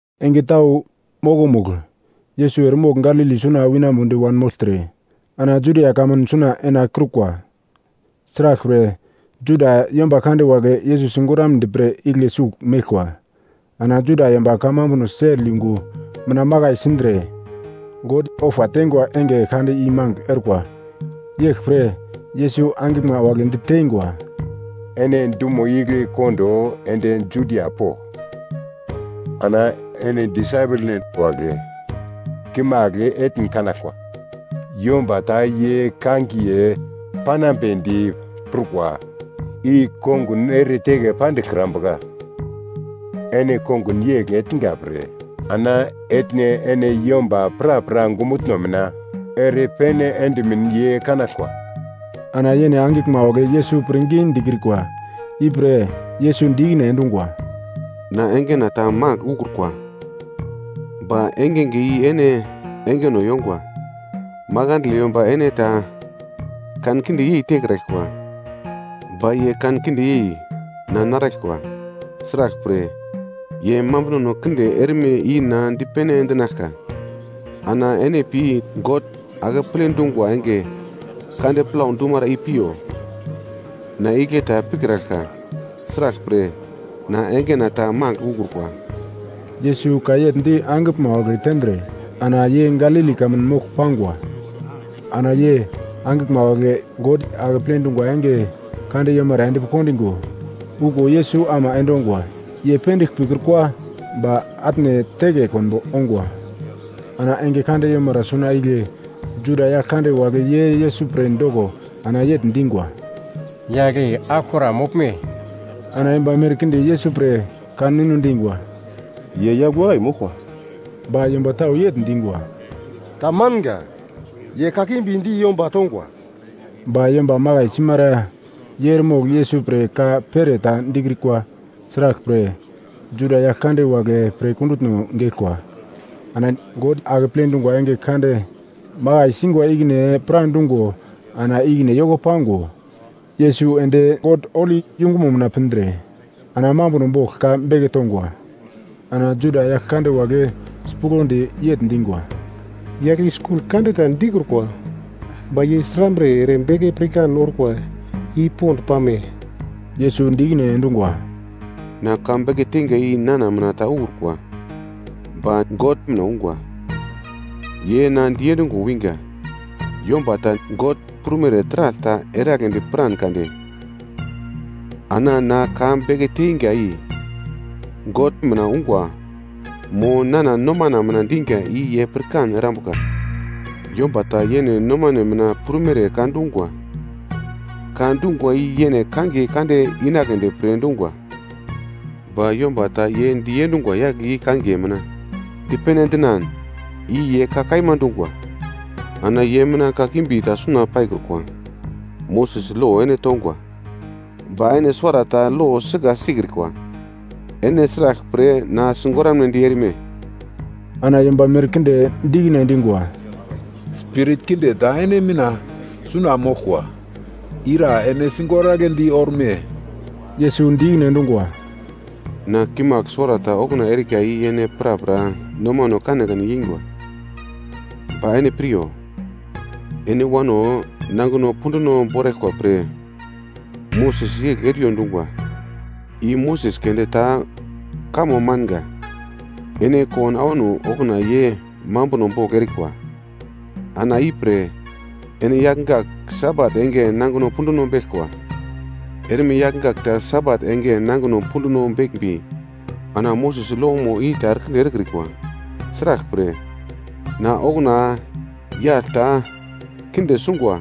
Enge tau mokomugl, Yesus eremogl Galili suna winambodi wanmogltre, ana Judia kamun suna enakiurkwa. Sraglpre, Juda yomba kande wagle Yesus sigoramnedi pre igle sugl meglkwa. Ana Juda yomba kamambuno sel yungu mina makai sindre God ofa teingwa enge kande i magl orkwa. Yeglpre Yesus angiglma wagle diteingwa, “Ene dumo igle kondo ende Judia po, ana ene disaipelnen wagle kimagl etn kanaglkwa. Yomba ta ye kangiye panambedi pirkwa i kongun ere teke pandiglkrambuka. Ene kongun yegl etnga pre, ana etne ene yomba prapra ongumutno mina ere pene endimin ye kanaglkwa.” Ana yene angiglma wagle Yesus pirngi dikrikwa. Ipre Yesus di ikine endungwa, “Na engena ta magl ukrukwa. Ba engenge i ene engeno yongwa. Makandle yomba ene ta kankinde yei tekraglkwa, ba ye kankinde yei na naraglkwa. Sraglpre, ye mambunono kinde erme i na dipene endinaglka. Ana ene pi God Akeple Dungwa enge kande plau dumara i piyo. Na igle ta pikraglka, sraglpre na engena ta magl ukrukwa.” Yesus ka yegl di angiglma tendre ana ye Galili kamun mogl pangwa. Ana ye angiglma wagle God Akeple Dungwa enge kande yomara endpi kondingo, okuwo Yesus ama endongwa. Ye pendigl pikrukwa, ba atne teke konbo ongwa. Ana enge kande yomara suna igle Juda yagl kande wagle ye Yesus pre doko ana yegl dingwa, “Yagl i aglokra moglme?” Ana yomba merkinde Yesus pre ka ninu dingwa, “Ye yagl wakai moglkwa.” Ba yomba tau yegl dingwa, “Ta manga, ye kakimbi di yomba tongwa.” Ba yomba makai simara ye eremogl Yesus pre ka pere ta dikrikwa, sraglpre, Juda yagl kande wagle pre kundutno geglkwa. Ana God Akeple Dungwa enge kande makai singwa ikine pradungo ana ikine yoko pango, Yesus ende God holi yungumo mina pindre, ana mambuno bogl ka beke tongwa. Ana Juda yagl kande wagle sipuglodi yegl dingwa, “Yagl i skul kande ta dikrukwa. Ba ye srambre ere beke pirkan orkwa i pond pame?” Yesus di ikine endungwa, “Na ka beke teinga i nana mina ta ukrukwa, ba God mina ungwa. Ye na diendungo winga. Yomba ta God prumere taragl ta eragledi piran kade, ana na ka beke teinga i God mina ungwa mo nana nomano mina diga i ye pirkan erambuka. Yomba ta yene nomane mina prumere ka dungwa, ka dungwa i yene kangiye kande inagledi prukwa. Ba yomba ta ye diendungwa yagle i kangiye mina dipene endinan i ye ka kaima dungwa, ana ye mina kakimbi ta suna paikrukwa. Moses lo ene tongwa. Ba ene suwarata lo i sika sikrikwa. Ene sraglpre na sigoramnedi erme?” Ana yomba merkinde di ikine endingwa, “Spirit kinde ta ene mina suna moglkwa, ira ene sigoragledi orme?” Yesus di ikine endungwa, “Na kimagl suwarata okuna erika i ene prapra nomano kanekane yeingwa. Ba ene piryo, ene wano nangino punduno boraglkwa pre Moses yegl eriyo dungwa. I Moses keunde ta kamo manga. Ene kowano awano okuna ye mambuno bogl erikwa. Ana i pre ene yagl gak Sabat enge nangino punduno beglkwa. Erme yagl gak ta Sabat enge nangino punduno beglmbi ana Moses lomo i ta erekinde erekrikwa. Sraglpre na okuna yagl ta kinde sungwa,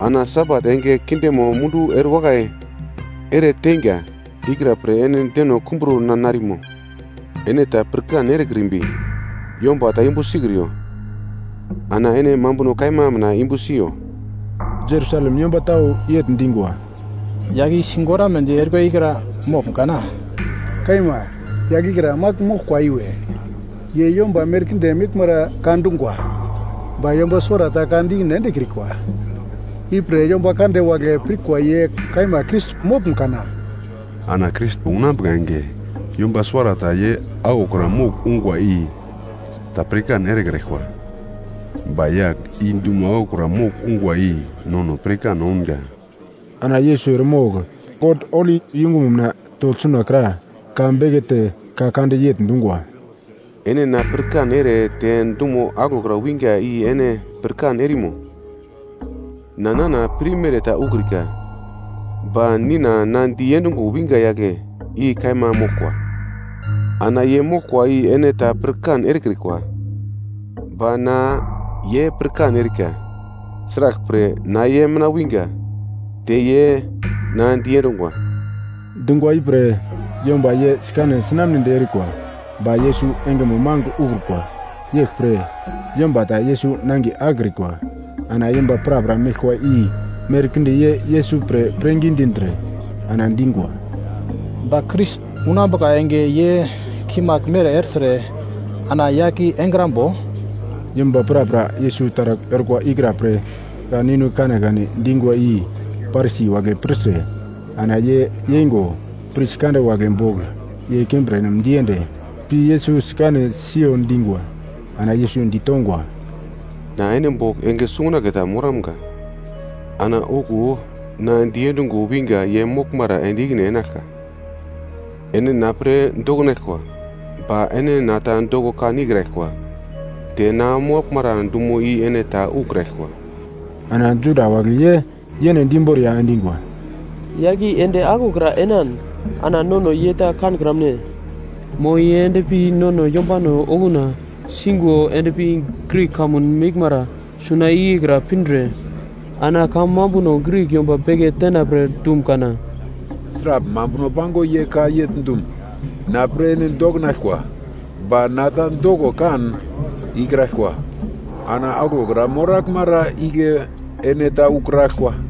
ana Sabat enge kindemo mundu erewakai ere teinga ikra pre ene deno kumbro na narimo? Ene ta pirkan erekrimbi yomba ta yumbu sikriyo, ana ene mambuno kaima mina yumbu siyo.” Jerusalem yomba tau yegl dingwa, “Yagl i sigoramnedi erikwa ikra moglum kana? Kaima, yagl ikra magl moglkwa iwe. Ye yomba merkinde meglmara ka dungwa, ba yomba suwarata ka di ikine endekrikwa. I pre yomba kande wagle pirkwa ye kaima Krais moglme kana? Ana Krais unambuka enge yomba suwarata ye aglokra mogl ungwa i ta pirkan erekraglkwa. Ba yagl i dumo aglokra mogl unga i nono pirkan ounga.” Ana Yesus eremogl God holi yungumo mina togl sunakra ka bekete ka kande yegl dungwa, “Ene na pirkan ere te dumo aglokra winga i ene pirkan erimo? Na nana pirmere ta ukrika, ba Nina na diendungo winga yagle i kaima moglkwa. Ana ye moglkwa i ene ta pirkan erekrikwa. Ba na ye pirkan erika, sraglpre na ye mina winga, te ye na diendungwa.” Dungwa ipre yomba ye sikane sinamnedi erikwa, ba Yesus engemo magl ukrukwa. Yeglpre, yomba ta Yesus nangiye akekrikwa. Ana yomba prapra meglkwa i merkinde ye Yesus pre pirngi dindre ana dingwa, “Ba Krais unambuka enge ye kimagl mere ertre ana yagl i engrambo?” Yomba prapra Yesus taragl orkwa ikra pre ka ninu kanekane dingwa i Parisi wagle pirtre, ana ye yeingo pris kande wagle bogl ye kimbirnem diende, pi Yesus sikane siyo dingwa. Ana Yesus ditongwa, “Na ene bogl enge sungunagle ta moramga, ana okuwo na diendungo winga ye moglmara ende ikine enaglka. Ene na pre doknaglkwa, ba ene na ta doko kan ikraglkwa, te na moraglmara dumo i ene ta ukraglkwa.” Ana Juda wagle ye yene di imboriya endingwa, “Yagl i ende aglokra enan, ana nono ye ta kankramune? Mo ye endpi nono yombano okuna singo endpi Grik kamun meglmara suna igle kra pindre, ana kamambuno Grik yomba beke tenapre dum kana? Sragl mambuno pango ye ka yegl dum, ‘Na pre ene doknaglkwa, ba na ta doko kan ikraglkwa, ana aglokra moraglmara igle ene ta ukraglkwa?’”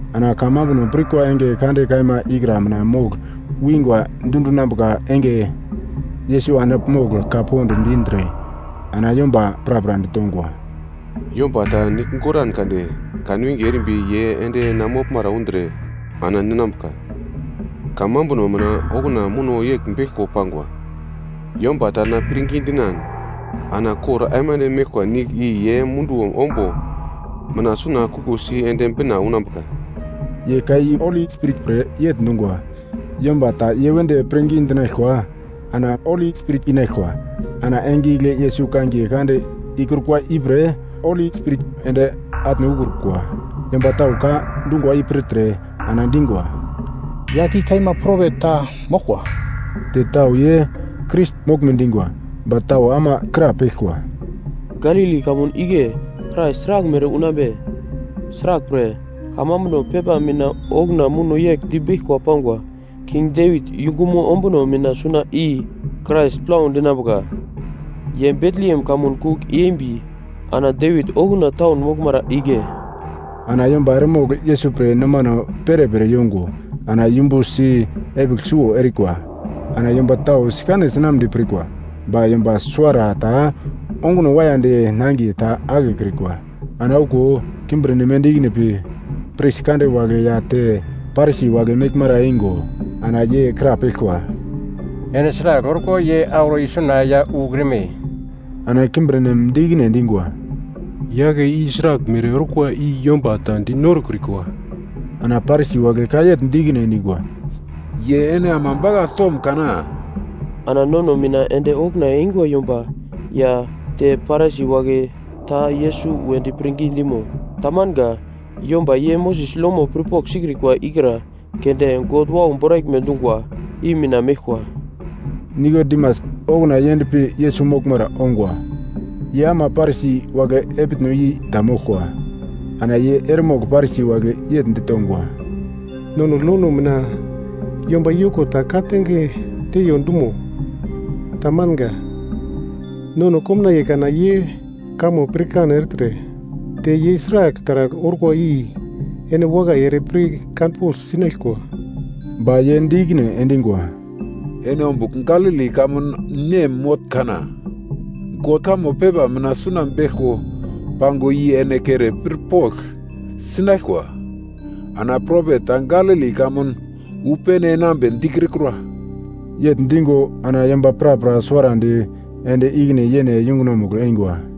Ana kamambuno pirkwa enge kande kaima ikra mina mogl wingwa dundinambuka enge Yesus andigl mogl ka pond dindre ana yomba prapra ditongwa, “Yomba ta nigl goran kade kanwinge erimbi ye ende na moglmara undre ana ninambuka. Kamambuno mina okuna muno yegl beglko pangwa: ‘Yomba ta na pirngi dinan, ana kor aimande meglkwa nigl i yene munduwo ombo mina suna kuglosi ende bina unambuka.’” Ye ka i Holi Spirit pre yegl dungwa. Yomba ta ye wedi pirngi dinaglkwa, ana Holi Spirit inaglkwa. Ana enge igle Yesus kangiye kande ikrukwa ipre Holi Spirit ende atne ukrukwa. Yomba tau ka dungwa i pirtre, ana dingwa, “Yagl i kaima propet ta moglkwa.” Te tau ye Krais moglme dingwa. Ba tau ama krapeglkwa, “Galili kamun igle Krais sraglmere unambe?” Sraglpre, kamambuno pepa mina okuna muno yegl di beglkwa pangwa, “King Devit yungumo ombuno mina suna i Krais plau dinambuka, ye Betlehem kamun kugl yembi, ana Devit okuna taun moglmara igle.” Ana yomba eremogl Yesus pre nomano perepere yongo, ana yumbusi epigl suwo erikwa. Ana yomba tau sikane sinamnedi pirkwa, ba yomba suwarata onguno waiyadi nangiye ta akekrikwa. Ana okuwo kimbirnem ende ikine pi pris kande wagle ya te Parisi wagle meglmara eingo, ana ye krapeglkwa, “Ene sragl orko ye auro isuna ya ukrime?” Ana kimbirnem di ikine endingwa, “Yagle i sraglmere orkwa i yomba ta di norokrikwa.” Ana Parisi wagle ka yegl di ikine endingwa, “Ye ene ama bakagl tom kana? Ana nono mina ende okuna eingwa yomba ya te Parisi wagle ta Yesus wedi pirngi dimo? Tamanga, yomba ye Moses lomo pirpogl sikrikwa ikra keunde God wau boraglme dungwa i mina meglkwa.” Nikodimas, okuna ye endpi Yesus moglmara ongwa. Ye ama Parisi wagle epitno i ta moglkwa, ana ye eremogl Parisi wagle yegl ditongwa, “Nono lono mina yomba yoko ta ka-tange teiyo dumo? Tamanga, nono komnaiye kana ye kamo pirkan ertre, te ye sragl taragl orkwa i ene wakai ere pir kanpogl sinaglkwa.” Ba ye di ikine endingwa, “Ene ombugl Galili kamun nem motn kana? God kamo pepa mina suna beglko pangwa i ene kere pirpogl sinaglkwa. Ana propet ta Galili kamun wu pene enambe dikrikura.” Yegl dingo ana yomba prapra suwarandi ende ikine yene yungunomugl eingwa.